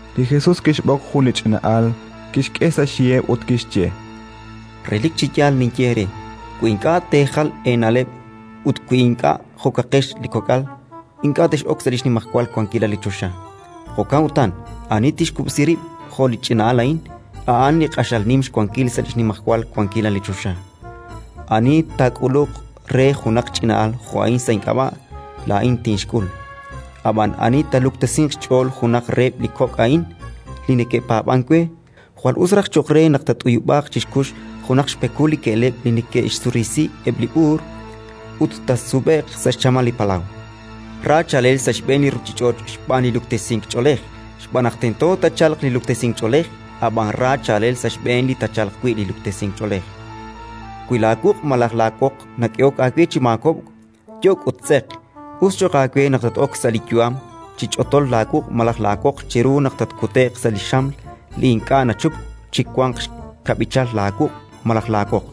Li Jesus kixb'oq jun li ch'ina'al, kixk'e sa' xyiheb' ut kixye: —Relik chi yaal ninye eere: wi ink'a' teejal eena'leb' ut wi ink'a' jo'kaqex li kok'al, ink'a' tex'ok sa' li xnimajwal wankilal li choxa. Jo'kan utan, ani tixkub'si rib' jo' li ch'ina'al a'in, a'an li q'axal nim xwankil sa' li xnimajwal wankilal li choxa. “Ani taak'uluq re junaq ch'ina'al jo' a'in sa' ink'ab'a', laa'in tinxk'ul. Ab'an ani taaluktesinq xch'ool junaq reheb' li kok' a'in li neke'paab'ank we, jwal us raj cho'q re naq taat'uyub'aaq chi xkux junaq xpekul li ke'leb' li neke'xsurisi eb' li b'uur, ut taasub'e'q sa' xchamal li palaw. Ra chaalel sa' xb'een li ruuchich'och' xb'aan li luktesink ch'oolej! Xb'aan naq tento taachalq li luktesink ch'oolej, ab'anan ra chaalel sa' xb'een li taachalq wi' li luktesink ch'oolej! “Wi laawuq' malaj laawoq nak'ehok aawe chi maakob'k, yok' ut tz'eq: us cho'q aawe naq tat-ok sa' li yu'am chi ch'otol laawuq' malaj laawoq chiru naq tatkute'q sa' li xam li ink'a' nachupk chi wanq xkab'ichal laawuq' malaj laawoq.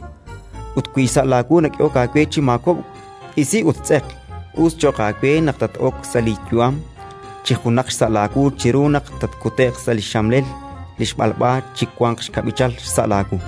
Ut wi xsa' laawu nak'ehok aawe chi maakob'k, isi ut tz'eq: us cho'q aawe naq tat-ok sa' li yu'am chi junaq xsa' laawu chiru naq tatkute'q sa' li xxamlel li xb'alb'a chi wanq xkab'ichal xsa' laawu.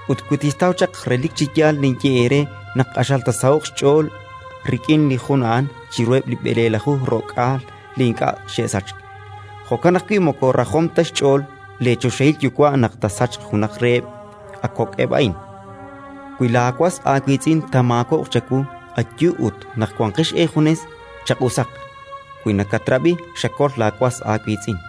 Ut wi tixtaw chaq, relik chi yaal ninye eere naq q'axal taasaho'q xch'ool rik'in li jun a'an chiruheb' li b'eleelaju ro'k'aal li ink'a' xe'sachk. Jo'kan ajwi' moko rajom ta xch'ool leechoxahil Yuwa' naq taasachq junaq reheb' a kok'eb' a'in. “Wi laawas aawiitz'in taamaakob'q chawu, ayu ut, naq wanqex eejunes, chaq'usaq. Wi nakatrab'i, xakol laawas aawiitz'in.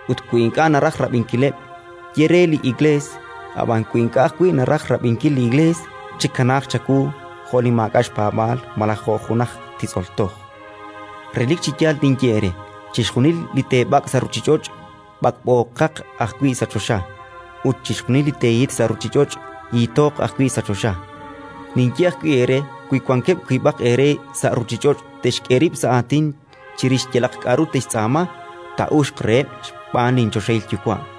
Ut wi ink'a' naraj rab'inkileb', ye re li Iklees; ab'an wi ink'a' ajwi' naraj rab'inkil li Iklees, chikanaaq chawu jo' li maak'a' xpaab'aal malaj jo' jun aj titz'ol toj. “Relik chi yaal ninye eere: chixjunil li teeb'ak' sa' ruuchich'och', b'ak'b'ooq ajwi' sa' choxa, ut chixjunil li teehit sa' ruuchich'och', hithooq ajwi' sa' choxa. “Ninye ajwi' eere: wi wankeb' wiib'aq eere sa' ruuchich'och' te'xk'e rib' sa' aatin chirix yalaq k'aru te'xtz'aama, taa'uxq reheb' xb'aan linchoxahil Yuwa'.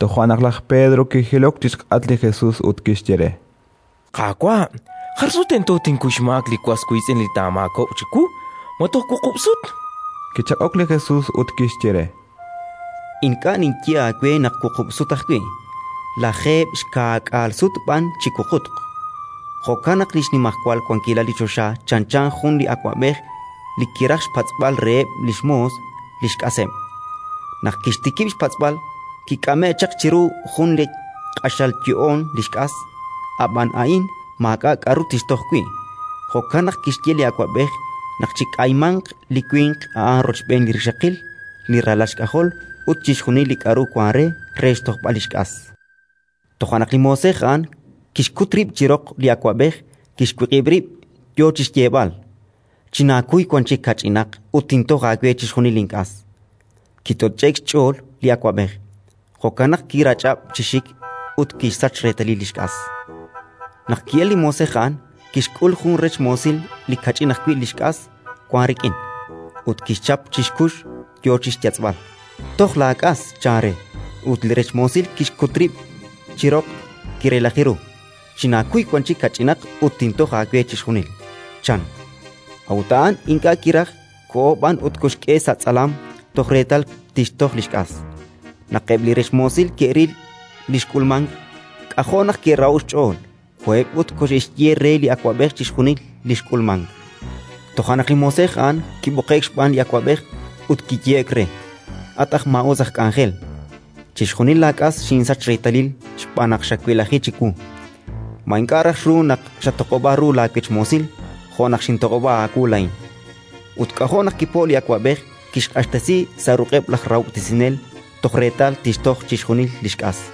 Toja' naq laj Pedro kijilok chi xk'atq li Jesus ut kixye re: —Qaawa', jar sut tento tinkuy xmaak li was wiitz'in li taamaakob'q chiwu? Ma toj wuqub' sut? Kichaq'ok li Jesus ut kixye re: —Ink'a' ninye aawe naq wuqub' sut ajwi', lajeeb' xkaak'aal sut b'an chi wuqutq. “Jo'kan naq li xnimajwal wankilal li choxa chanchan jun li awab'ej li kiraj xpatz'b'al reheb' li xmoos li xk'aseb'. Naq kixtikib' xpatz'b'al, kik'ame'k chaq chiru jun li q'axal yo'oon li xk'as. Ab'an a'in maak'a' k'aru tixtoj wi'; jo'kan naq kixye li awab'ej naq chik'aymanq li winq a'an rochb'een li rixaqil, li ralal xk'ajol ut chixjunil li k'aru wank re, re xtojb'al li xk'as. Toja' naq li moosej a'an kixkut rib' chi roq li awab'ej, kixwiq'ib' rib', yo chi xyeeb'al: «Chinaakuy wan chik kach'inaq ut tintoj aawe chixjunil link'as». Kitoch'e'k xch'ool li awab'ej; jo'kan naq kirach'ab' chi xik ut kixsach reetalil li xk'as. “Naq ki'elk li moosej a'an, kixk'ul jun rech moosil li kach'in ajwi' li xk'as wank rik'in, ut kixchap chi xkux, yo chi xyatz'b'al: «Toj laak'as», chan re. Ut li rech moosil kixkut rib' chi roq, kirelaji ru: «Chinaakuy wan chik kach'inaq ut tintoj aawe chixjunil», chan. A'ut a'an ink'a' kiraj, koho b'an ut koxk'e sa' tz'alam toj reetal tixtoj li xk'as. “Naq eb' li rech moosil ke'ril li xk'ulmank, k'ajo' naq ke'raho'k xch'ool; koheb' ut koxe'xye re li awab'ej chixjunil li xk'ulmank. Toja' naq li moosej a'an kib'oqe'k xb'aan li awab'ej ut kiyehe'k re: «At aj maa'us aj k'anjel, chixjunil laak'as xinsach reetalil xb'aan naq xawelaji chiwu. Ma ink'a' raj xruuk naq xatoq'ob'a ru laawech moosil, jo' naq xintoq'ob'a aawu laa'in?». Ut k'ajo' naq kipo'k li awab'ej: kixq'axtesi sa' ruq'eb' laj rahob'tesinel toj reetal tixtoj chixjunil li xk'as.